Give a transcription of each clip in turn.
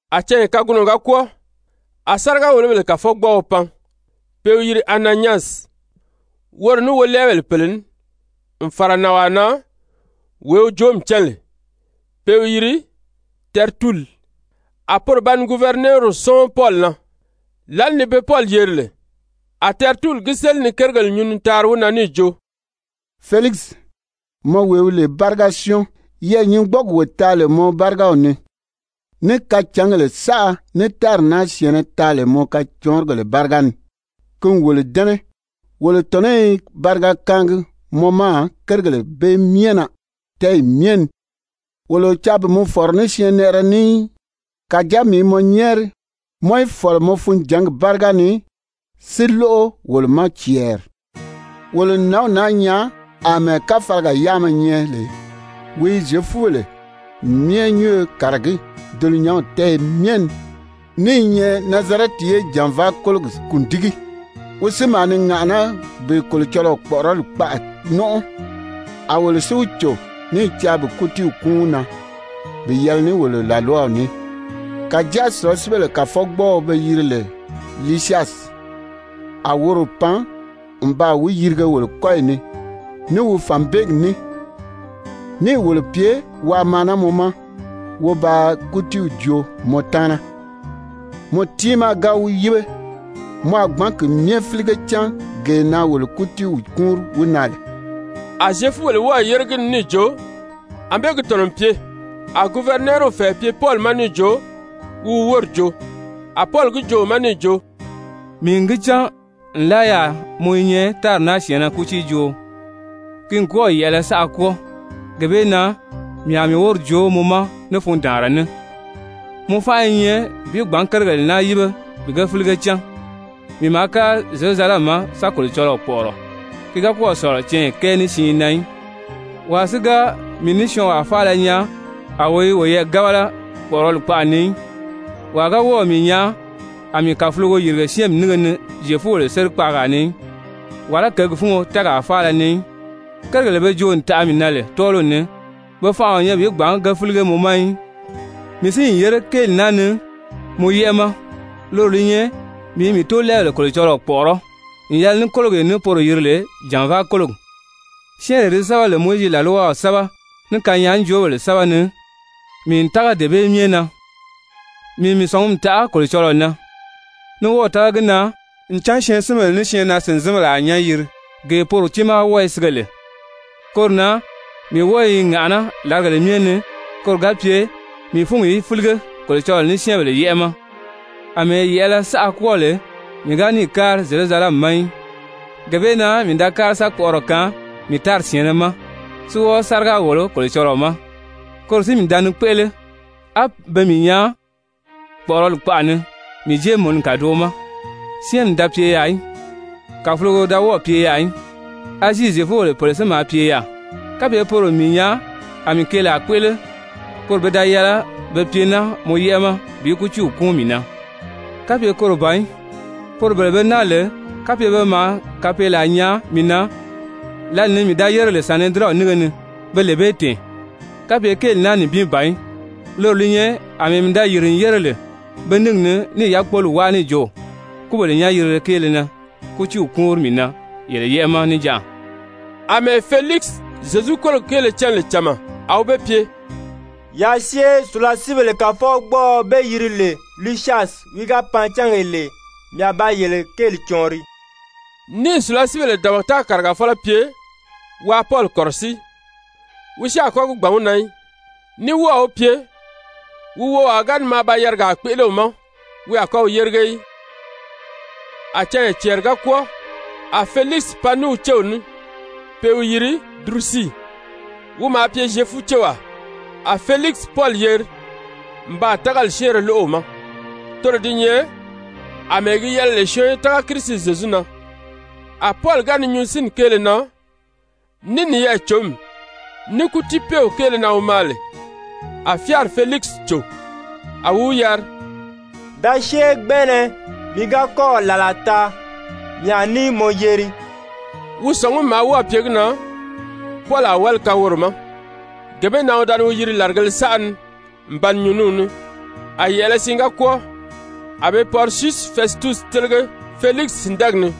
A canya kagunɔ ga kwɔ́ɔ, a sáriga-wòlobèle kàfɔgbɔɔɔ pan, pe i wi yiri Ananyasi, woro ní wolɛɛbèle pèle ní, n fàra nànwaa na wee wi joomi cán lè, pe i wi yiri Tɛrituli. A poro ba ni guvɛrinɛɛriw sɔ́ɔn Pɔli na. Lǎli ni be Pɔli yeri lè, a Tɛrituli gi séli ni kérigèle nyuu ni taari wi na níì jo: «Felikisi, mɔ wee wi lè báriga-syɔ́ɔn, yɛɛ̀nyingbɔɔgi wo taa lè mɔ bárigaw ni, ní kacǎngèle saʔa ní tári naa syɛ̀ɛnnɛ taa lè mɔ kacɔɔnrigèle báriga ni, ki n wolo dɛ́nɛ. Wolo tɔ̀nɔ́ i bariga kaangi mɔ ma kérigèle bee myɛ na tɛ́ɛyi myɛ ni. Wolo o caa bi mɔ fɔ̀rɔ ní syɛɛnnɛʔɛrɛ ní í, kàjáa mii i mɔ nyɛ́ɛri mɔ í fɔ̀lɔ mɔ funjǎngi báriga ni si lóʔo wolo ma cɛɛri. Wolo n nǎnw naa nyaa àmɛɛ káfalaga yáama nyɛ lè, wi i Zyefubèle myɛ nyúnyo kàragí dulunyanw tɛ́ɛyɛ myɛ ni, ní i nyɛ Nazarɛti ye jànvaa kólogi kùndigi, wi si maa ni ŋàʔaná bi Kolocɔlɔɔ kpɔ̀ʔɔrɔli kpaʔa nɔ́nʔɔ. A wolo si wi cò [ní i caa bi kútiiw kúun wi na bi yɛlɛ ní wolo làlwaw ní, kàjáa sùlasiibèle kàfɔgbɔɔɔ be yiri lè Lisyasi, a woro pan n baa wi yirige wolo kɔ́yi ni ní wi fànbeegi ní, níì wolo pye waa maa naa mɔ ma wo ba kútiiw joo mɔ taana]. Mɔ tiimaa ga wi yíbe, mɔ a gbǎn ki myɛ fílige cán gee na wolo kútiiw kúunri wi na lè.» A Zyefubèle wɔ́ɔ̀ yére gi ni níì jo, ànbée gi tɔ̀nɔ n pye. A guvɛrinɛɛriw fɛ̀ɛ pye Pɔli ma níì jo wi wi wóri joo, a Pɔli gi joo wi ma níì jo: «Mii n gi cán nlaa yaà mɔ i nyɛ tári naa syɛ̀ɛnnɛ kútiijooo, ki n kɔ́ɔ̀ yɛ̀ʔɛlɛ saʔa kwɔ́ɔ. Gee bee na mii a mii wóri joo mɔ ma ní fundaanra ní. Mɔ fánʔa i nyɛ bi gbǎn kérigèle naa yíbe bi ge fílige cán, mii maa kári Zyerusalɛmi ma sa Kolocɔlɔɔ kpɔ̀ʔɔrɔ, ki ga kɔ́ɔ̀ sɔ̀lɔ canya kɛɛ ní siin na í. Wàa si ga mii ní syɔɔnwaa faala nyaa a wo i woyɛɛ gábala kpɔ̀ʔɔrɔli kpaʔa ni í, wàa ga wɔ́ɔ̀ mii nyaa a mii kàfulogo yìrige syɛ́ɛnmi nínge ni Zyefubèle sérikpaagaa ni í, wàlá kěgi fúngo tɛ́ɛgaa faala ni í. Kérigèle be joo n taʔa mii na lè tɔ́ɔliw ni, pe fanʔa o nyɛ bi gbǎn ge fílige mɔ ma í. Mii si n yére kéeli naa ni mɔ yɛ́ʔɛ ma, loro li nyɛ mii i mii tóolɛɛbèle Kolocɔlɔɔ kpɔ̀ʔɔrɔ́ n yɛlɛ ní kólogee ní poro yiri lè jànvaa kólogi. Syɛ́ɛnree di sɛ́bɛ lè Mowizi làlwaw sɛ́bɛ, ní kanyaajoobèle sɛ́bɛ ni, mii n tága dee bee myɛ na. Mii n mii sɔ̀ngumi taʔa Kolocɔlɔɔ na, ní wɔ́ɔ̀ tága gi na ncan syɛɛnsinbèle ní syɛɛnnaa-sìnzinbèle a nyán yiri, gee poro tiimaa wɔ́ɔ i sige lè. Koro na mii wɔ́ɔ i ŋàʔaná làrigèle myɛ ni koro ga pye mii fúngi í fílige Kolocɔlɔɔ ní syɛ́ɛnbèle yɛ́ʔɛ ma. Amɛɛ yɛ̀ʔɛlɛ saʔa kwɔ́ɔ lè mii ga níì kári Zyerusalɛmi ma í, gee bee na mii da kári sa kpɔʔɔrɔ kaan mii tári syɛ̀ɛnnɛ ma, si wɔ́ɔ sáriga wòlo Kolocɔlɔɔ ma. Koro si mii da ni kpéʔele á be mii nyaa kpɔ̀ʔɔrɔli kpaʔa ni mii jéemununi kàdoʔo ma, syɛ́ɛnmi da pye yaà í, kàfulogo da wɔ́ɔ̀ pye yaà í. Azii Zyefubèle pèle si maa pye yaà. Kapye poro n mii nyaa a mii keelaa kpéʔele, poro pe da yɛlɛ be pye naa mɔ yɛ́ʔɛ ma bi kútiiw kúun mii na. Kapye koro ban í, poro bele be naa lè, kapye pe maa kapeelaa nyaa mii na lǎli ni mii da yére lè Sanedirɛnw nínge ni, pe lee bee tɛ̀ɛn, kapye kéeli naa nibin ban í, loro li nyɛ àmɛɛ mii da yìri n yére lè pe níngi ni níì yákpoli wáa níì jo: ‹Kúbèle nyán-yirile kéele na kútiiw kúunri mii na yele yɛ́ʔɛ ma níjanʔa.›» Amɛɛ Felikisi Zyezu kólogi kéele cán lè cama, a wi be pye: «Yaa syée. Sùlasiibèle kàfɔgbɔɔɔ be yiri lè Lisyasi wi ga pan cángee lè, mii a ba yele kéeli cɔɔnri,» níì sùlasiibèle dabata kàrigafɔlɔ pye waa Pɔli kɔ̀rɔsíi, wi si a kɔ́ gi gbàn wi na í, ní wɔ́ɔ̀ wi pye, wi wowaa ga ni maa ba yarigaa kpéʔele wi ma, wi a kɔ́ wi yérige í. A canya cɛɛri ga kwɔ́ɔ, a Felikisi pan ní wi céw ní pe i wi yiri Durusii, wi maa pye Zyefucewaa. A Felikisi Pɔli yeri n baa tágali syɛ́ɛnrɛ lóʔo wi ma, toro di nyɛ àmɛɛ gi yɛlɛ lè syɔɔn í tága Kirisi Zyezu na. A Pɔli ga ni nyuu sínni kéele na, ní niyɛɛ-cǒmi, ní kútiipeew kéele na wi maa lè, a fyáari Felikisi cò, a wi wi yari: «Da syée gbɛnʔɛnɛ, mii ga kɔ́ɔ̀ làlaa taa, mii a ní mɔ yeri.» Wi sɔ̀ngumi maa wɔ́ɔ̀ pye gi na Pɔli a wáli kaan woro ma. Gee bee na wi da ni wi yiri làrigēle saʔa ni n ba ni nyuu ní wi ní. A yɛ̀ʔɛlɛ siin ga kwɔ́ɔ, a be Pɔrisyusi Fɛsitusi télege Felikisi sìndɛɛgi ni.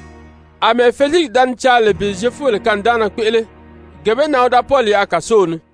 Amɛɛ Felikisi da ni caa lè bi Zyefubèle kanidaanna kpéʔele, gee bee na wi da Pɔli yaʔa kàsow ni.